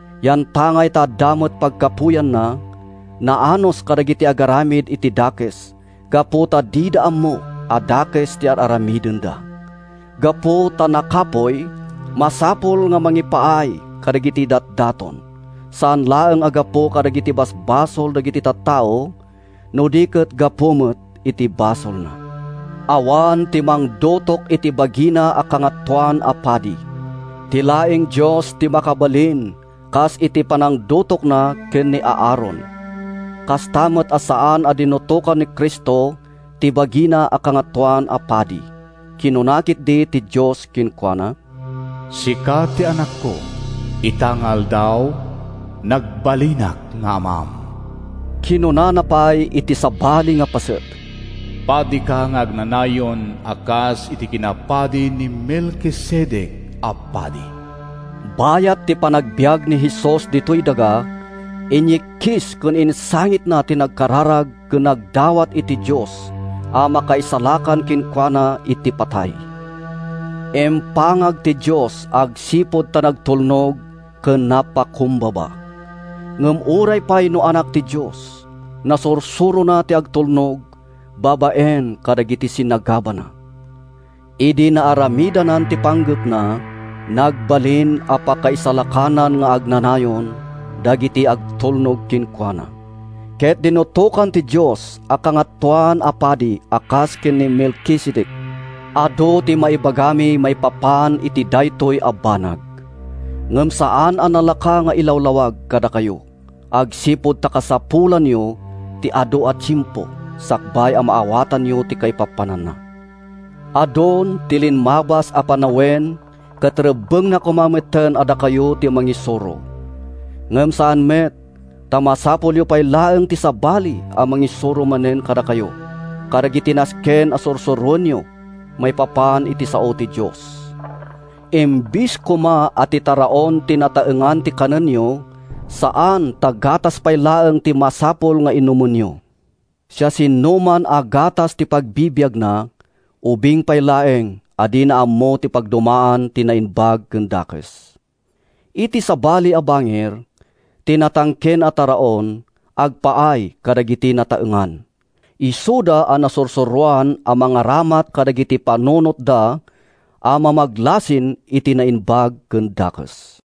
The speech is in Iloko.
Yantangay ta adda met pagkapuyanna, naanus kadagiti agaramid iti dakes gapu ta dida ammo a dakes ti ar-aramidenda. Gapu ta nakapuy, masapul a mangipaay kadagiti datdaton, saan laeng a gapu kadagiti basbasol dagiti tattao, no di ket gapu met iti basolna. Awan ti mangdutok iti bagina a kangatoan a padi. Ti laeng Dios ti makabalin, kas iti panangdutokna ken ni Aaron. Kasta met a saan a dinutokan ni Cristo ti bagina a Kangatoan a Padi. Kinuna ketdi ti Dios kenkuana, “Sika ti Anakko; Ita nga aldaw, nagbalinak nga Amam.” Kinunana pay iti sabali a paset, “Padika nga agnanayon A kas iti kinapadi ni Melkisedec a padi.” Bayat ti panagbiag ni Jesus ditoy daga, inyikkis ken insangitna ti nagkararag ken nagdawat iti Dios a makaisalakan kenkuana iti patay. Impangag ti Dios agsipud ta natulnog ken napakumbaba. Ngem uray pay no Anak ti Dios, nasursurona ti agtulnog babaen kadagiti sinagabana. Idi naaramidnan ti panggepna, nagbalin a pakaisalakanan nga agnanayon dagiti agtulnog kenkuana, ket dinutokan ti Dios a Kangatoan a Padi a kas ken ni Melkisedec. Adu ti maibagami maipapan iti daytoy a banag, ngem saan a nalaka nga ilawlawag kadakayo agsipud ta kasapulanyo ti adu a tiempo sakbay a maawatanyo ti kaipapananna. Adun ti limmabas a panawen ket rebbengna koma metten a dakayo ti mangisuro. Ngem saan met, ta masapulyo pay laeng ti sabali a mangisuro manen kadakayo kadagiti nasken a sursuroenyo maipapan iti Sao ti Dios. Imbes koma a ti taraon ti nataengan ti kanenyo, saan ta gatas pay laeng ti masapul nga inumenyo. Siasinoman a gatas ti pagbibiagna, ubing pay laeng a dina ammo ti pagdumaan ti naimbag ken dakes. Iti sabali a bangir, ti natangken a taraon, agpaay kadagiti nataengan, isuda a nasursuroan a mangaramat kadagiti panunotda a mamaglasin iti naimbag ken dakes.